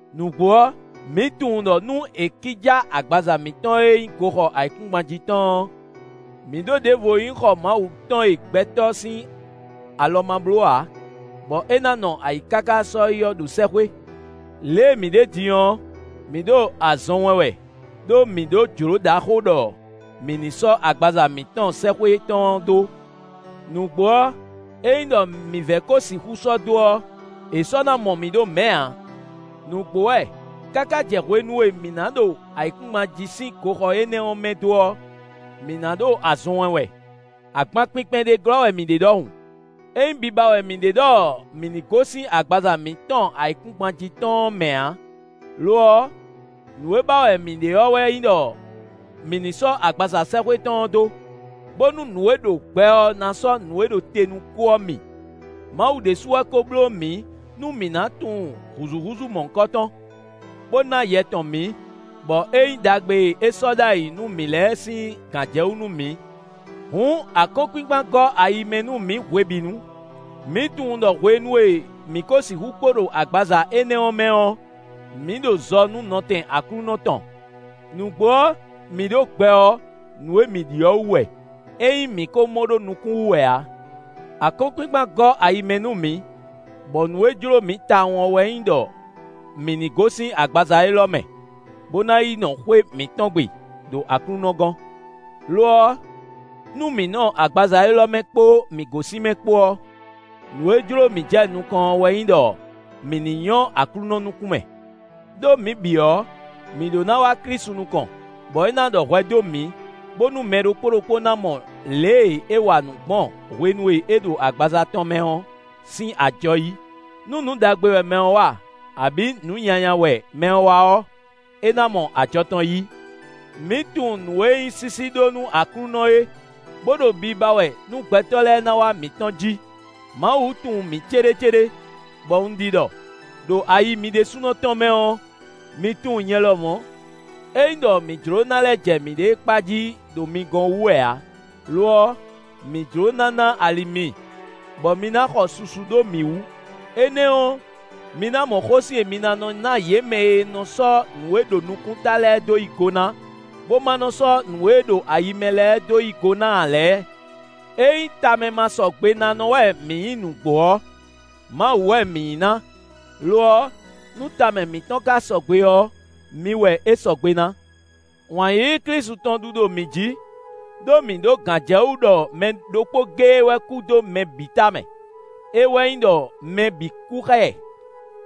Nǔgbó ɔ́, mǐ tunwun ɖɔ nú è kíjá agbaza mǐtɔn e nyí goxɔ ayǐkúngban jí tɔn ɔ́, mǐ ɖó ɖěvo e nyí xɔ Mawu tɔn e gbɛtɔ́ sín alɔ ma bló ǎ, bɔ é ná nɔ ayǐ káká sɔ́yi ɔ́ ɖo sɛ́xwé. Lě e mǐ ɖe din ɔ́, mǐ ɖo azɔn wɛn wɛ, ɖó mǐ ɖó jlǒ ɖaxó ɖɔ mǐ ní sɔ́ agbaza mǐtɔn sɛ́xwé tɔn ɔ́ dó. Nǔgbó ɔ́, ényí ɖɔ mǐ vɛ ko sixú sɔ́ dó ɔ́, è sɔ́ ná mɔ mǐ ɖo mɛ̌ ǎ. Nǔgbó wɛ! Káká jɛ hwenu e mǐ ná ɖo ayǐkúngban jí sín goxɔ énɛ́ ɔ́ mɛ dó ɔ́, mǐ ná ɖo azɔn wɛn wɛ, agban kpinkpɛn ɖé glɔ́ wɛ mǐ ɖe ɖɔhun. É nyí biba wɛ mǐ ɖe ɖɔ mǐ ní gosín agbaza mǐtɔn ayǐkúngban jí tɔn ɔ́ mɛ ǎ; lo ɔ́, nǔ e ba wɛ mǐ ɖe ɔ́ wɛ nyí ɖɔ mǐ ní sɔ́ agbaza sɛ́xwé tɔn ɔ́ dó, bónú nǔ e ɖo gbɛ ɔ́ ná sɔ́ nǔ e ɖo te nú kú ɔ́ mi. Mawu ɖésú wɛ kó bló mǐ nú mǐ ná tunwun hǔzúhúzú mɔ̌hunkɔtɔn, bó ná Yɛ tɔn mǐ, bɔ é nyí ɖagbe e é sɔ́ ɖ'ayǐ nú mǐ lɛ́ɛ sín gǎnjɛwú nú mǐ. Hǔn akɔ́nkpinkpan gɔ́ ayi mɛ nú mǐ hwebǐnu. Mǐ tunwun ɖɔ hwenu e mǐ ko sixú kpo ɖo agbaza énɛ́ ɔ́ mɛ ɔ́, mǐ ɖo zɔ nú nɔtɛn Aklúnɔ tɔn. Nǔgbó ɔ́, mǐ ɖo gbɛ ɔ́, nǔ e mǐ ɖi ɔ́ wú wɛ; é nyí mǐ kó mɔ ɖó nukún wú wɛ ǎ. Akɔ́nkpinkpan gɔ́ ayi mɛ nú mǐ, bɔ nǔ e jló mǐ tawun ɔ́ wɛ nyí ɖɔ mǐ ní gosín agbaza élɔ́ mɛ, bó ná yi nɔ xwé mǐtɔn gbe, ɖo Aklúnɔ gɔ́n. Lo ɔ́, nú mǐ nɔ agbaza élɔ́ mɛ kpó mǐ gosín mɛ kpó ɔ́, nǔ e jló mǐ jɛ nukɔn ɔ́ wɛ nyí ɖɔ mǐ ní nyɔ́ Aklúnɔ nukún mɛ. Đó mǐ bǐ ɔ́, mǐ ɖó ná wá Klísu nukɔn, bɔ é ná ɖɔ hwɛ dó mǐ, bónú mɛ ɖokpó ɖokpó ná mɔ lě e é wa nǔ gbɔn hwenu e é ɖo agbaza tɔn mɛ ɔ́ sín ajɔ yí; nú nǔ ɖagbe wɛ mɛ ɔ́ wa, abǐ nǔ nyanya wɛ mɛ ɔ́ wa ɔ́, é ná mɔ ajɔ tɔn yí. Mǐ tunwun nǔ e nyí sísí ɖó nú Aklúnɔ é, bó ɖo biba wɛ nú gbɛtɔ́ lɛ́ɛ ná wá mǐtɔn jí. Mawu tunwun mǐ céɖécéɖé, bɔ un ɖi ɖɔ, ɖo ayi mi ɖésúnɔ tɔn mɛ ɔ́, mi tunwun nyɛ lɔmɔ̌. É nyí ɖɔ mǐ jló ná lɛ́ jɛ mǐɖée kpa jí ɖo mi gɔ́n wú wɛ ǎ; lo ɔ́, mǐ jló ná ná ali mi, bɔ mi ná xɔ susu ɖó mǐ wú; énɛ́ ɔ́, mi ná mɔ xósin e mi ná nɔ ná yě mɛ e nɔ sɔ́ nǔ e ɖo nukúnta lɛ́ɛ dó yí go ná, bó ma nɔ́ sɔ́ nǔ e ɖo ayi mɛ lɛ́ɛ dó yí go ná ǎ lɛ́ɛ. Ényí tamɛmasɔgbenánɔ wɛ mǐ nyí nǔgbó ɔ́, Mawu wɛ mǐ nyí ná; lo ɔ́, nú tamɛ mǐtɔn ka sɔgbe ɔ́, mi wɛ é sɔgbe ná. Wǎn yíyí Klísu tɔn ɖu ɖo mǐ jí, ɖó mǐ ɖó gǎnjɛwú ɖɔ mɛ ɖokpó géé wɛ kú dó mɛ bǐ tamɛ; é wɛ nyí ɖɔ mɛ bǐ kú xá ɛ.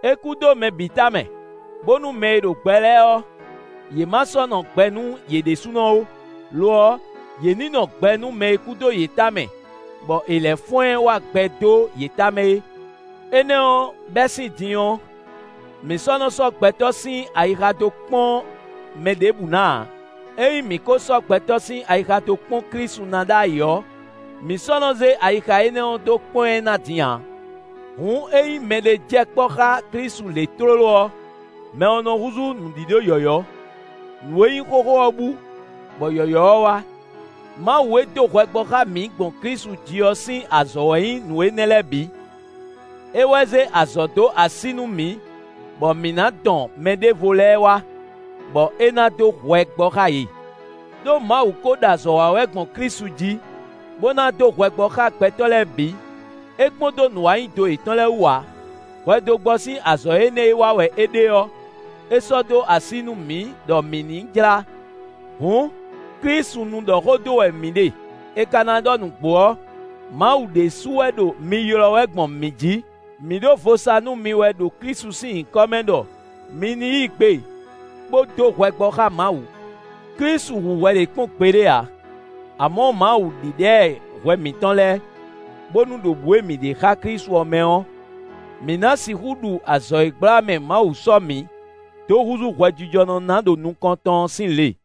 É kú dó mɛ bǐ tamɛ, bónú mɛ e ɖo gbɛ lɛ́ɛ ɔ́, yě ma sɔ́ nɔ gbɛ nú yě ɖésúnɔ ó; lo ɔ́, yě ní nɔ gbɛ nú mɛ e kú dó yě tamɛ, bɔ è lɛ́ fɔ́n ɛ wá gbɛ dó yě tamɛ é. Énɛ́ ɔ́, bɛ́ sín din ɔ́, mǐ sɔ́ nɔ sɔ́ gbɛtɔ́ sín ayixa dó kpɔ́n mɛ ɖěbǔ ná ǎ; ényí mǐ ko sɔ́ gbɛtɔ́ sín ayixa dó kpɔ́n Klísu ná ɖ'ayǐ ɔ́, mǐ sɔ́ nɔ́ zé ayixa énɛ́ ɔ́ dó kpɔ́n ɛ ná din ǎ. Hǔn ényí mɛɖé jɛ kpɔ́ xá Klísu lě tlóló ɔ́, mɛ ɔ́ nɔ húzú nǔɖíɖó yɔ̌yɔ́: nǔ e nyí xóxó ɔ́ bú, bɔ yɔ̌yɔ́ ɔ́ wá. Mawu e dó hwɛ gbɔ xá mǐ gbɔn Klísu jí ɔ́ sín azɔ̌ wɛ nyí nǔ énɛ́ lɛ́ɛ bǐ; é wɛ zé azɔ̌ dó así nú mǐ, bɔ mǐ ná dɔn mɛɖěvo lɛ́ɛ wá, bɔ é ná dó hwɛ gbɔ xá yě. Đó Mawu kó ɖo azɔ̌ wa wɛ gbɔn Klísu jí, bó ná dó hwɛ gbɔ xá gbɛtɔ́ lɛ́ɛ bǐ; é kpɔ́n dó nǔwanyido yětɔn lɛ́ɛ wú ǎ. Hwɛdógbɔ sín azɔ̌ énɛ́ e wa wɛ é ɖe ɔ́, é sɔ́ dó así nú mǐ ɖɔ mǐ ní jlá. Hǔn, Klísu nu ɖɔ xó dó wɛ mǐ ɖe, è ka ná ɖɔ nǔgbó ɔ́, Mawu ɖésú wɛ ɖo mi ylɔ́ wɛ gbɔn mǐ jí: mǐ ɖo vo sa nú mi wɛ, ɖo Klísu sín nyǐkɔ mɛ ɖɔ mi ní yí gbe bó dó hwɛ gbɔ xá Mawu. Klísu hu hwɛ ɖě kpɔ́n gbeɖé ǎ; amɔ̌ Mawu ɖíɖá ɛ hwɛ mǐtɔn lɛ́ɛ, bónú ɖo bǔ e mǐ ɖe xá Klísu ɔ́ mɛ ɔ́, mǐ ná sixú ɖu azɔ̌ e gbla mɛ Mawu sɔ́ mǐ dó húzú hwɛjijɔnɔ ná ɖo nukɔn tɔn ɔ́ sín le.